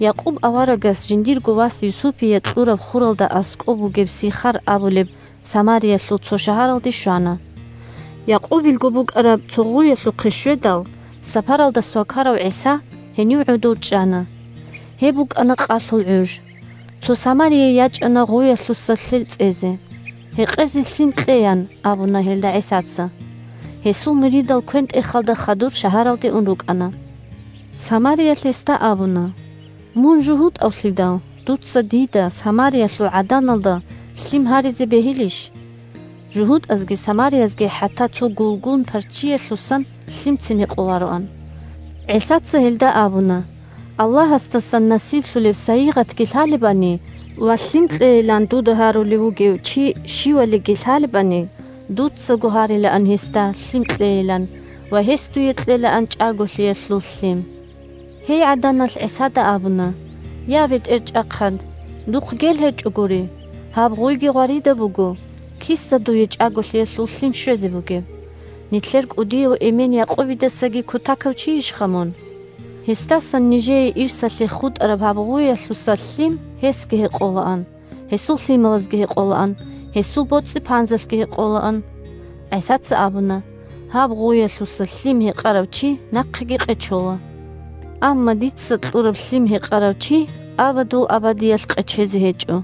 Якъуб аварагас жиндирго вас Юсупие кьураб хуралда аскӀоб бугеб Сихар абулеб Самариялъул цо шагьаралде щвана. Якъубилго букӀараб цо гъуялъухъе щведал, сапаралда свакарав ГӀиса гьенив гӀодов чӀана. Гьеб букӀана къалъул гӀуж. Цо самарияй ячӀана гъуялъуса лъел цӀезе. – Гьекъезе лъим кье, – ян абуна гьелда ГӀисаца. (Гьесул муридал квен-тӀехалда хадур шагьаралде ун рукӀана.) Самариялъ гьесда абуна: – Мун жугьутӀавлъидал, дуца дида – Самариялъул гӀаданалда – лъим гьаризе бегьилищ? (ЖугьутӀазги самариязги хӀатта цо гулгун-парччиялъусан лъимцин гьекъолароан.) ГӀисаца гьелда абуна: – Аллагьасдасан насиблъулеб сайигъатги лъалебани ва лъим кьейилан дуда гьарулев вугев чи щивалиги лъалебани, дуцаго гьарилаан гьесда лъим кьейилан, ва гьес дуе кьелаан чӀаголъиялъул лъим. Гьей гӀаданалъ ГӀисада абуна: – Я, бетӀерчӀахъад, духъ гел гьечӀогури, гьаб гъуйги гъваридаб буго. Киса дуе чӀаголъиялъул лъим щвезе бугеб? Нилъер кӀудияв эмен Якъубидасаги кутакав чийищха мун? Гьесдасан нижее ирсалъе хутӀараб гьаб гъуялъуса лъим гьесги гьекъолаан, гьесул лъималазги гьекъолаан, гьесул боцӀи-панзалъги гьекъолаан. ГӀисаца абуна: – Гьаб гъуялъуса лъим гьекъарав чи нахъеги къечола. Амма дица кьураб лъим гьекъарав чи абадул абадиялъ къечезе гьечӀо.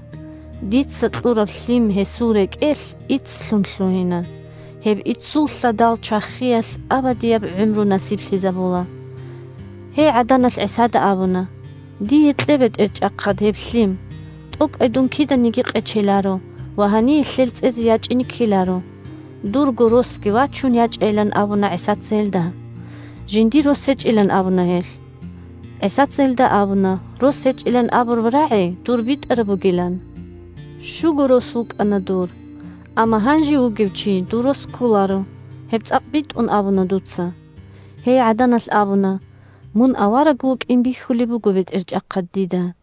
Дица кьураб лъим гьесул рекӀелъ иццлъун лъугьина. Гьеб иццул лъадал чвахиялъ абадияб гӀумру насиблъизабула. Гьей гӀаданалъ ГӀисада абуна: – Дие кье, бетӀерчӀахъад, гьеб лъим. ТӀокӀай дун киданиги къечеларо ва гьание лъел цӀезе ячӀине ккеларо. Дурго росги вачун ячӀайилан абуна ГӀисаца гьелда. Жиндир рос гьечӀилан абуна гьелъ. ГӀисаца гьелда абуна рос гьечӀилан абураб рагӀи дур битӀараб бугилан. Щуго рос вукӀана дур. Амма гьанже вугев чи дур рос кколаро, гьеб цӀакъ битӀун абуна дуца. Гьей гӀаданалъ абуна: – Мун авараг вукӀин бихьулеб буго, бетӀерчӀахъад, дида.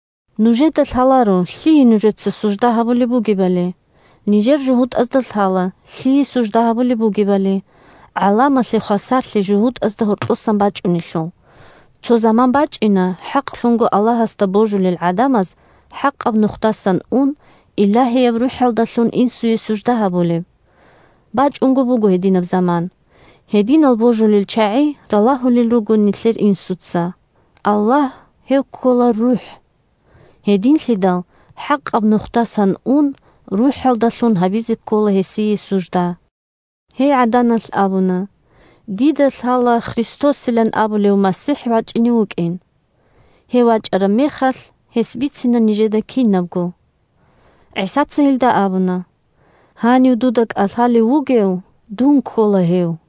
Нужеда лъаларо лъие нужеца сужда гьабулеб бугебали. Нижер жугьутӀазда лъала лъие сужда гьабулеб бугебали, гӀаламалъе хвасарлъи жугьутӀазда гьоркьосан бачӀунелъул. Цо заман бачӀина хӀакълъунго Аллагьасда божулел гӀадамаз хӀакъаб нухдасан ун, Илагьияб РухӀалдалъун Инсуе сужда гьабулеб. БачӀунго буго гьединаб заман. Гьединал божулел чагӀи ралагьулел руго нилъер Инсуца. Аллагь – гьев ккола РухӀ. Гьединлъидал хӀакъаб нухдасан ун, РухӀалдалъун гьабизе ккола гьесие сужда. Гьей гӀаданалъ абуна: – Дида лъала Христосилан абулев МасихӀ вачӀине вукӀин. Гьев вачӀараб мехалъ, гьес бицина нижеда кинабго. ГӀисаца гьелда абуна: – Гьанив дуда кӀалъалев вугев дун ккола гьев.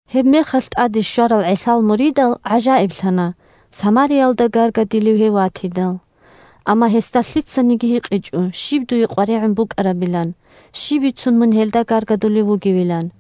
Гьебмехалъ тӀаде щварал ГӀисал муридал гӀажаиблъана самариялда гаргадилев гьев ватидал. Амма гьесда лъицаниги гьикъичӀо щиб дуе къваригӀун букӀарабилан, щиб бицун мун гьелда гаргадулев вугевилан.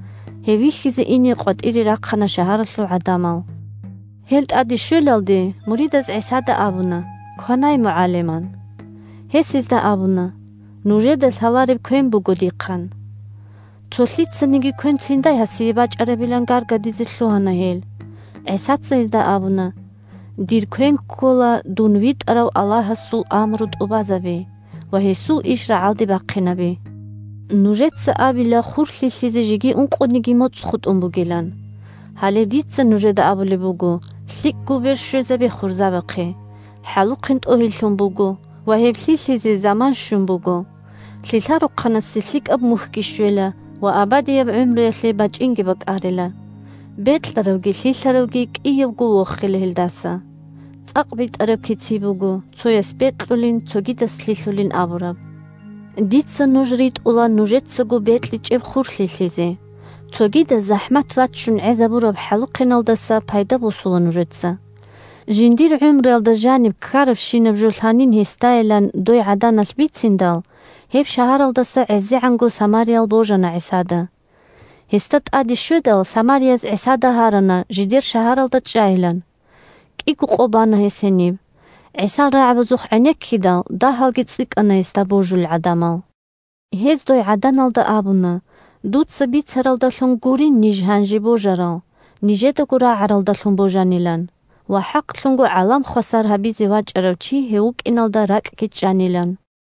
Гьев вихьизе ине къватӀире рахъана шагьаралъул гӀадамал. Гьел тӀаде щвелалде, муридаз ГӀисада абуна: – Кванай, МугӀалим, – ан. Гьес гьезда абуна: – Нужеда лъалареб квен буго дихъ, – ан. Цо лъицаниги квенциндай гьасие бачӀарабилан гаргадизе лъугьана гьел. ГӀисаца гьезда абуна: – Дир квен ккола дун витӀарав Аллагьасул амру тӀубазаби ва гьесул иш рагӀалде бахъинаби. Нужеца абила хур лъилъизе жеги ункъониги моцӀ хутӀун бугилан. Гьале дица нужеда абулеб буго: лъикӀго бер щвезабе хурзабахъе, хӀалухъен тӀогьиллъун буго ва гьеб лъилъизе заман щун буго! Лъилъарухъанасе лъикӀаб мухьги щвела ва абадияб гӀумруялъе бачӀинги бакӀарила. Бекьаравги лъилъаравги – кӀиявго – вохила гьелдаса. ЦӀакъ битӀараб кици буго, цояс бекьулин, цогидас лъилъулин абураб. Дица нуж ритӀула нужецаго бекьичӀеб хур лъилъизе. Цогидаз захӀмат баччун гӀезабураб хӀалухъеналдаса пайда босула нужеца! Жиндир гӀумруялда жаниб ккарабщинаб жо лъанин гьесдайилан дой гӀаданалъ бициндал, гьеб шагьаралдаса гӀезегӀанго самариял божана ГӀисада. Гьесда тӀаде щведал, самарияз ГӀисада гьарана жидер шагьаралда чӀайилан. КӀиго къо бана гьес гьениб. ГӀисал рагӀабазухъ гӀенеккидал, дагьалги цӀикӀкӀана гьесда божулел гӀадамал. Гьез дой гӀаданалда абуна дуца бицаралдалъун гурин ниж гьанже божарал, нижедаго рагӀаралдалъун божанилан ва хӀакълъунго гӀалам хвасар гьабизе вачӀарав чи гьев вукӀиналда ракӀги чӀанилан.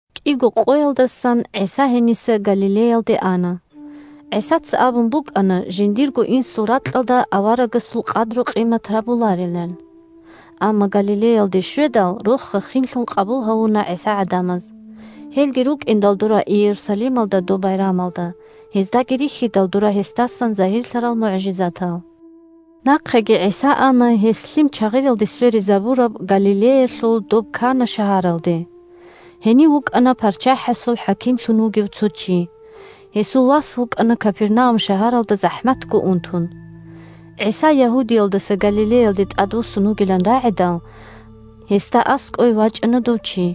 КӀиго къоялдасан ГӀиса гьениса Галилеялде ана. ГӀисаца абун букӀана жиндирго инсул ракьалда аварагасул къадру-къимат гьабуларилан. Амма Галилеялде щведал, роха-хинлъун къабул гьавуна ГӀиса гӀадамаз. Гьелги рукӀиндал дора Иерусалималда доб байрамалда, гьездаги рихьидал дора гьесдасан загьирлъарал мугӀжизатал. Нахъеги ГӀиса ана гьес лъим чагъиралде сверизабураб Галилеялъул доб Кана шагьаралде. Гьенив вукӀана парччахӀасул хӀакимлъун вугев цо чи. Гьесул вас вукӀана Капернаум шагьаралда захӀматго унтун. ГӀиса Ягьудиялдаса Галилеялде тӀадвуссун вугилан рагӀидал, гьесда аскӀове вачӀана дов чи,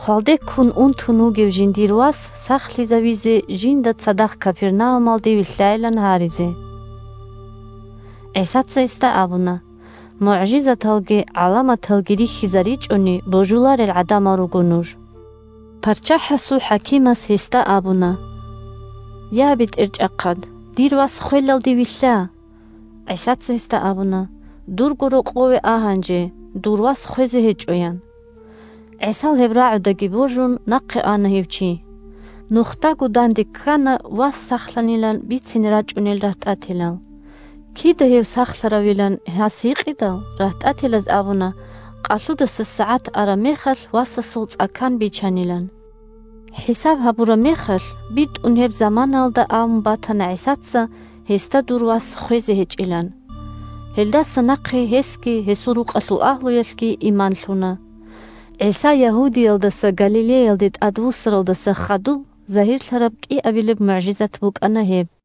хвалде ккун унтун вугев жиндир вас сахлъизавизе жинда цадахъ Капернаумалде вилълъайилан гьаризе. ГӀисаца гьесда абуна: – МугӀжизаталги гӀаламаталги рихьизаричӀони, божуларел гӀадамал руго нуж! ПарччахӀасул хӀакимас гьесда абуна: – Я, бетӀерчӀахъад, дир вас хвелалде вилълъа. ГӀисаца гьесда абуна: – Дурго рокъове а гьанже. Дур вас хвезе гьечӀо, – ян. ГӀисал гьеб рагӀудаги божун, нахъе ана гьев чи. Нухдаго данде ккана вас сахлъанилан бицине рачӀунел рагьтӀателал. Кида гьев сахлъаравилан гьас гьикъидал, рагьтӀателаз абуна къалъудаса сагӀат араб мехалъ васасул цӀа-кан бичанилан. ХӀисаб гьабураб мехалъ, битӀун гьеб заманаялда абун батана ГӀисаца гьесда дур вас хвезе гьечӀилан. Гьелдаса нахъе гьесги гьесул рукъалъул агьлуялъги иман лъуна. ГӀиса Ягьудиялдаса Галилеялде тӀадвуссаралдаса хадуб загьирлъараб кӀиабилеб мугӀжизат букӀана гьеб.